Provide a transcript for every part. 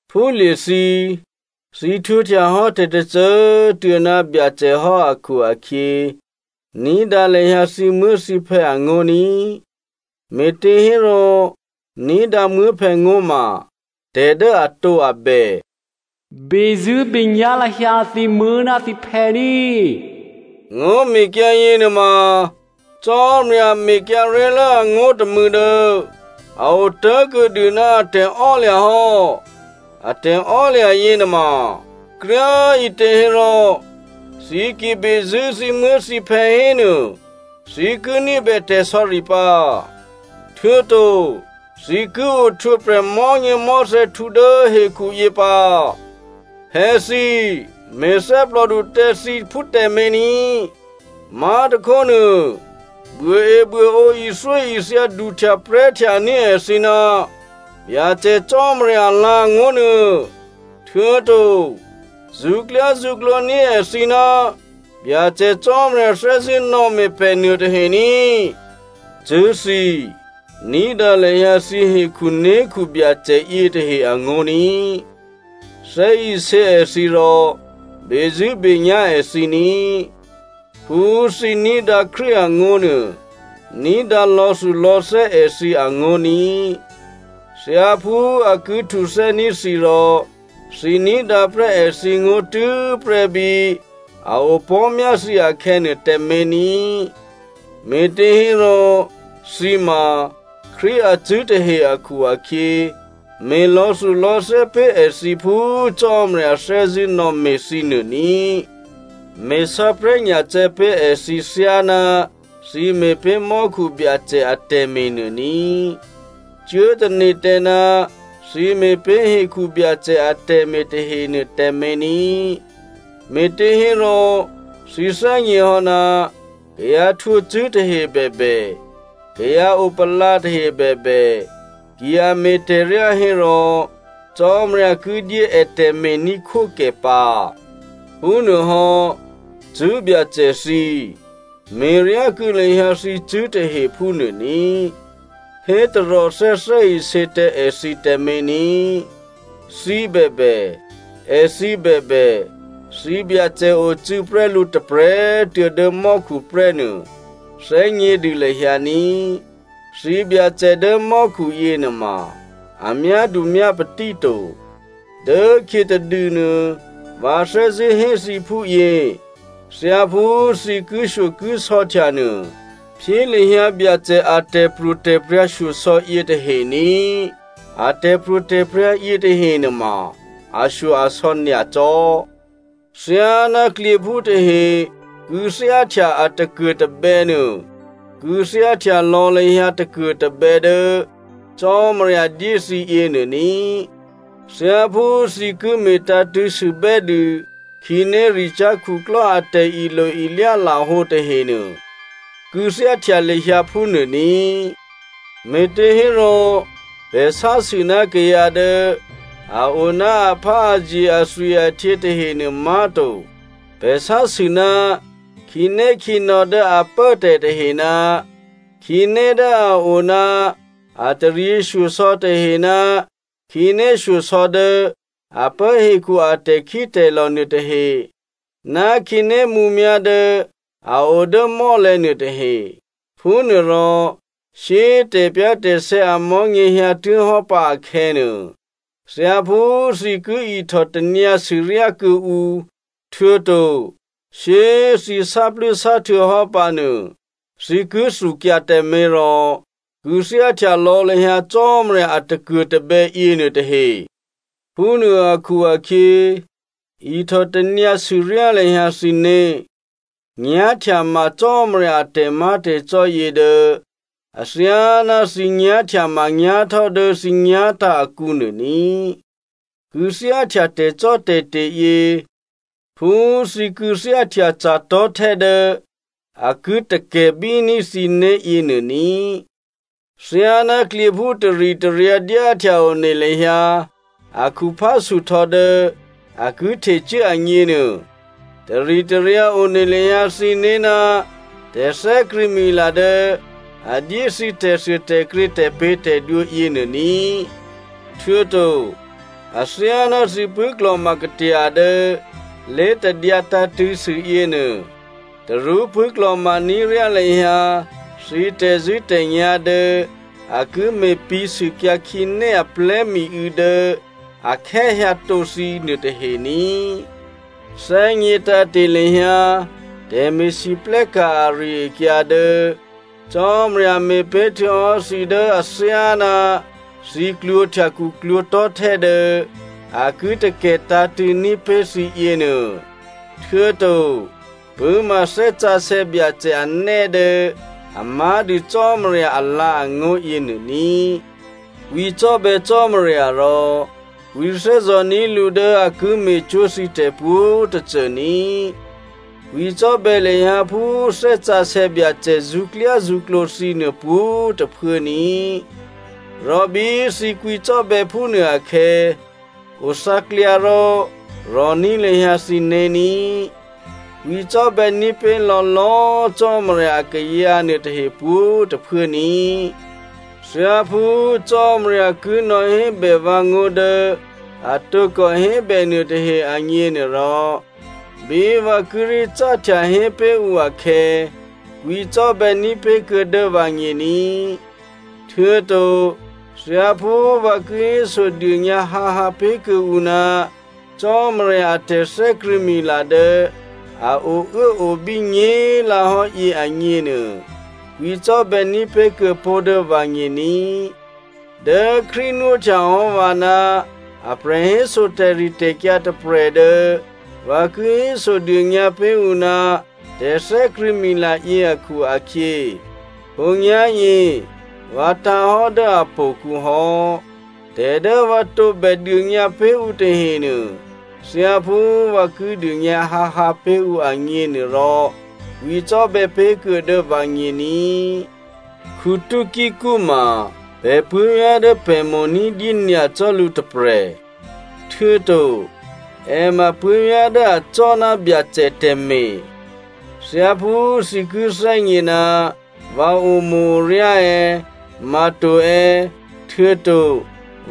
Phúlye̤thǐ, thǐ htwǒhtyahò́ tè̤tôcô꤮ tuô̌ ná Byacè hò́ akhu-akhyě, ní̤dǎ lahyǎ thǐmuố̤thǐphè̌ angó̤ ní꤮, me̤těhérò ní̤dǎ muố̤phè̌ngó̤ ma tè̤ dố atǒabè. “Bezṳ̂́benyá̤ lahyǎ thǐmuố̤ ná thǐphè̌ ní꤮.” Ngó̤mekyǎ yěnuôma Cò́marya mekyǎ ré̤lố angó̤ tômû̌ dố a otố̤kuô̌dû ná a tè̤ò́lya̤ hò́. A tè̤ò́lya̤ yěnuôma kryá꤮ ǐtě hérò, thǐ ki bezṳ̂́ thǐmuố̤thǐphè̌ hénuô, thǐ ki ní̤bè tè̤sò̌ri pǎ, htuô̌to thǐ ki ohtwǒprè̤ mò̤́nyěmò̤́thè̌htǔ dố hekhuyě pǎ. Phè̌thǐ, me̤thè́plòdu tǎ thǐphú tǎmé̤ ní꤮. Má̤tôkhónuô, buôebuôǒ ithyóithya duhtyaprè̤́htya ní̤ èthǐ ná Byacè Cò́marya alǎ̤angó̤ nuô, htuô̌to zṳ̌klyázṳ̌klǒní̤ èthǐ ná Byacè Cò́marya thè́zṳ̂́ nò̌me̤ pè̤ nuôtahe ní꤮. Cṳ̂́thǐ, ní̤dǎ lahyǎ thǐ hekhunékhu Byacè yětahe angó̤ ní꤮. Thè́isě èthǐ rò bezṳ̂́benyá̤ èthǐ ní꤮. Phú꤮ thǐ ní̤dǎ Krístu angó̤ nuô, ní̤dǎ lò̌thulò̌thè́ èthǐ angó̤ ní꤮. Thyáphú a ki htuthè́ní̤ thǐ rò thǐ ní̤dǎprè́ èthǐngó̤ tû́prè́ bí a opò̤́myá thǐ akhè̌nuô tǎmé̤ ní꤮. Me̤těhérò thǐ ma Krístu acṳ̂́ tahe akhu-akhyě, me̤ lò̌thulò̌thè́ pé̤ èthǐ phú Cò́marya thè́zṳ̂́ nò̌me̤ thǐ nuô ní꤮. Me̤ sǎprè̤́nyacè̌ pé̤ èthǐ thyáná thǐ me̤pé̤ mò́khu Byacè atè̤me̤ nuô ní꤮, cuố tane̤ tǎ ná thǐ me̤pé̤ hekhu Byacè atè̤me̤ tahenuô tǎmé̤ ní꤮. Me̤těhérò thǐ thè́gněhò́, kayǎ htwǒcṳ̂́ tahe bèbè, kayǎ opalǎ tahe bèbè, ki a me̤ tè̤ryá hérò Cò́marya ki dyé è tè̤me̤ní̤khwókè pǎ. Phúnuôhò́, cṳ̂́byacè thǐ꤮, me̤ryákuô̌ lahyǎ thǐcṳ̂́ tahe phúnuô ní꤮. Hé taròthè́ thè́isě tǎ èthǐ tǎmé̤ ní꤮. Thǐ bèbè, èthǐ bèbè, thǐ Byacè ocû̌ prè́ lǔ tôprè̤꤮ tuô̌ dố mò́khu prè́nuô, thè́gnědû lahyǎ ní꤮. Thǐbyacè dố mò́khu yěnuôma, a myádu myápatí to. Dốkhyě tadûnuô, vǎ thè́zṳ̂́ hé thǐ phúyě, thyáphú thǐ kishyokisò̌htya nuô, phyé lahyǎ Byacè a tè̤pro̤tè̤prya̤ shyosò̌ yětahe ní꤮. A tè̤pro̤tè̤prya̤ yětahe nuôma ashyo-asò̌ nyacò́. Thyáná klyěphú tahe kû̌thyáhtya a takuô̤tabè̌ nuô, kû̌thyáhtya lò̌ lahyǎ takuô̤tabè̌ dố Cò́marya dyé thǐ yěnuô ní꤮. Thyáphú thǐ ki me̤tǎ̤tṳ̂̌ sûbè́dû khǐnéricyá̤ khuklò́ a tè̤ilo-ilyá lahǒ tahenuô, kû̌thyáhtya lahyǎ phúnuô ní꤮. Me̤těhérò, pè̤ sásû ná kayǎ dố a o ná apháazye athwi-ahtyě tahenuô má̤to. Pè̤ sásû ná khǐnékhǐnò̌ dố a pốtè̤ tahe, ná khǐné dố a o ná a taryěshyosò̌ tahe ná khǐné shyosò̌ dố a pố hekhu a tè̤khítè̤lò̤ nuôtahe, ná khǐné mǔmyá̤ dố a o dố mò́lè̤̌ nuôtahe. Phúnuôrò, shyé꤮ tè̤pyá̤tè̤sè̌ amò̤́nyě hyǎtuố̤hò́ pǎ akhè̌nuô, thyáphú thǐ ki ihtò tanyǎ sûryá kuô̌ǔ, htuô̌to shyé꤮ thǐ sáplû́sáhtuô̌hò́ pǎnuô, thǐ ki thukyǎ tǎmé̤nuô rò kû̌thyáhtya lò̌ lahyǎ Cò́marya a takuô̤tabè̌ yěnuô tahe. Phúnuô akhu-akhyě ihtò tanyǎ sûryá lahyǎ thǐné̤. Nyá̤htyama Cò́marya a tè̤má̤tè̤cò́ yě dố athyáná thǐ nyá̤htyamanyá̤htò́ dố thǐ nyá̤tǎ̤ akǔnuô ní꤮. Kû̌thyáhtya tè̤cò́tè̤te̤ yě phú thǐ kû̌thyáhtya ca̤tò̤́htè́ dố a ki takè̤bíní̤ thǐné̤ yěnuô ní꤮. Thyáná klyěphú taritaryǎ dyáhtya one lahyǎ a khuphá suhtò̌ dố a ki htecuố agněnuô, taritaryǎ one lahyǎ thǐné̤ ná tè̤thè́krṳ̂̌mila dố a dyé thǐ tè̤thuôtè̤krě tè̤pě̤tè̤dwǒ yěnuô ní꤮. Htuô̌to, athyáná thǐ pṳ̂́klò̤ma katya dố lé̤tadyǎ tǎ̤tṳ̂̌sû yěnuô, tarú pṳ̂́klò̤ma ní̤ ryá lahyǎ thǐ tè̤zṳ̂́tè̤nyá̤ dố a ki me̤pǐ̤ sûkyǎ khǐné aplè̤́ miû̌ dố a khè́ hyǎtǒ thǐ nuôtahe ní꤮. Thè́gně tǎ̤te̤ lahyǎ tè̤me̤lwóhteka̤ ari-akyǎ dố Cò́marya me̤pé̤ htuô̌hò́ thǐ dố athyáná thǐ klwǒ̤htya khuklwǒ̤tò̤́htè́ dố a ki takè̤ tǎ̤tṳ̂̌ní̤ pé̤ thǐ yěnuô, htuô̌to pṳ̂́ma Thè́ Sǎsè̌ Byacè anè́ dố a má̤dû Cò́marya alǎ̤angó̤ yěnuô ní꤮. Kwǐcò́bè̌ Cò́marya rò kwǐthè́zò̤ ní̤ lǔ dố a ki me̤cwó̤ thǐ tè̤pwǒ̤꤮ tôcô ní꤮. Kwǐcò́bè̌ lahyǎ phú Thè́ Sǎsè̌ Byacè zṳ̌klyázṳ̌klǒ thǐ nuô pwǒ̤꤮ tôphuố ní꤮. Rò bí thǐ kwǐcò́bè̌ phúnuô akhè̌, othǎklyǎ rò rò̤ní̤ lahyǎ thǐné̤ ní꤮. Kwǐcò́bè̌ ní̤pé̤lò̤̌ lò̌꤮ Cò́marya akayǎ nuôtahe pwǒ̤꤮ tôphuố ní꤮. Thyáphú Cò́marya ki nò̌hébè vǎ ngó̤ dố a tǒkò hébè nuôtahe agněnuôrò, bí vǎ kíré̤ cáhtya hé pé̤ ǔ akhè̌, kwǐcò́bè̌ ní̤pé̤kuô̌ dố vǎgně ní꤮. Htuô̌to thyáphú vǎ ki hésodônyǎ hǎhǎ pé̤kuô̌ǔ ná Cò́marya a tè̤thè́krṳ̂̌mila dố a ouốobí nyě̤꤮ lǎhò́yě agněnuô, kwǐcò́bè̌ ní̤pé̤ kuô̌pó̤ dố vǎgně ní꤮. Dố Krístu nwóhtya hò́ vǎ ná a prè̤héso tè̤ritè̤kyǎ tôprè̤ dố vǎ ki hésodônyǎ pé̤ ǔ ná tè̤thè́krṳ̂̌mila yě akhu-akhyě, khǒnyá̤yě vǎ tǎ̤hò́ dố htò̌kǔ hò́. Tè̤ dố vǎ tǒbè dônyǎ pé̤ ǔ tahenuô, thyáphú vǎ ki dônyǎ hǎhǎ pé̤ ǔ agněnuôrò, kwǐcò́bè̌ pé̤ kuô̌ dố vǎgně ní꤮. Tykico ma pè̤ puố̤vyá̤ dố pè̤ mo̤ ní̤dyé nyacò́ lǔ tôprè̤, htuô̌to è ma puố̤vyá̤ dố acò́ ná Byacè tè̤me̤. Thyáphú thǐ ki thè́gně ná vǎ omo̤-oryá è̌, ma to è̌, htuô̌to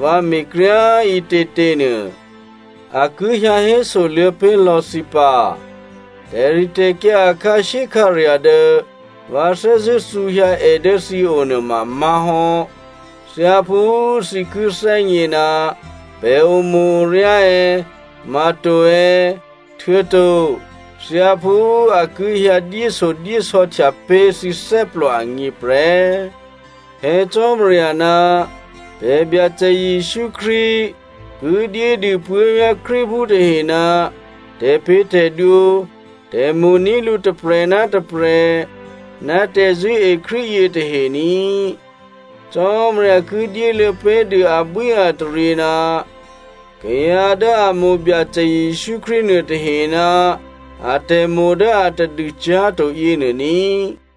vǎ me̤kryá꤮ ǐtětěnuô, a ki hyǎ hésoluô̌ pé̤lò̌ thǐ pǎ. Tè̤ritè̤kyǎ a khǎshyékhǎrya̤ dố vǎ thè́zṳ̂́ thǔhyǎ è dố thǐo nuôma má̤hò́, thyáphú thǐ ki thè́gně ná pè̤ omo̤-oryá è̌, ma to è̌, htuô̌to thyáphú a ki hyǎ dyéshyodyésò̌htya pé̤ thǐ thè́plò agně prè́. Phè̌ Cò́marya ná pè̤ Byacè Jesǔ Krístu ki dyédû puố̤vyá̤ Krístuphú tahe ná tè̤pě̤tè̤dwǒ, tè̤mo̤ní̤ lǔ tôprè̤ ná tôprè̤, ná tè̤zṳ̂́e Krístu yětahe ní꤮. Cò́marya ki dyéluô̌ pé̤dû abwíataryě ná kayǎ dố a mo̤ Byacè Jesǔ Krístu nuôtahe ná atè̤mo̤ dố atadû cyá̤to yěnuô ní꤮.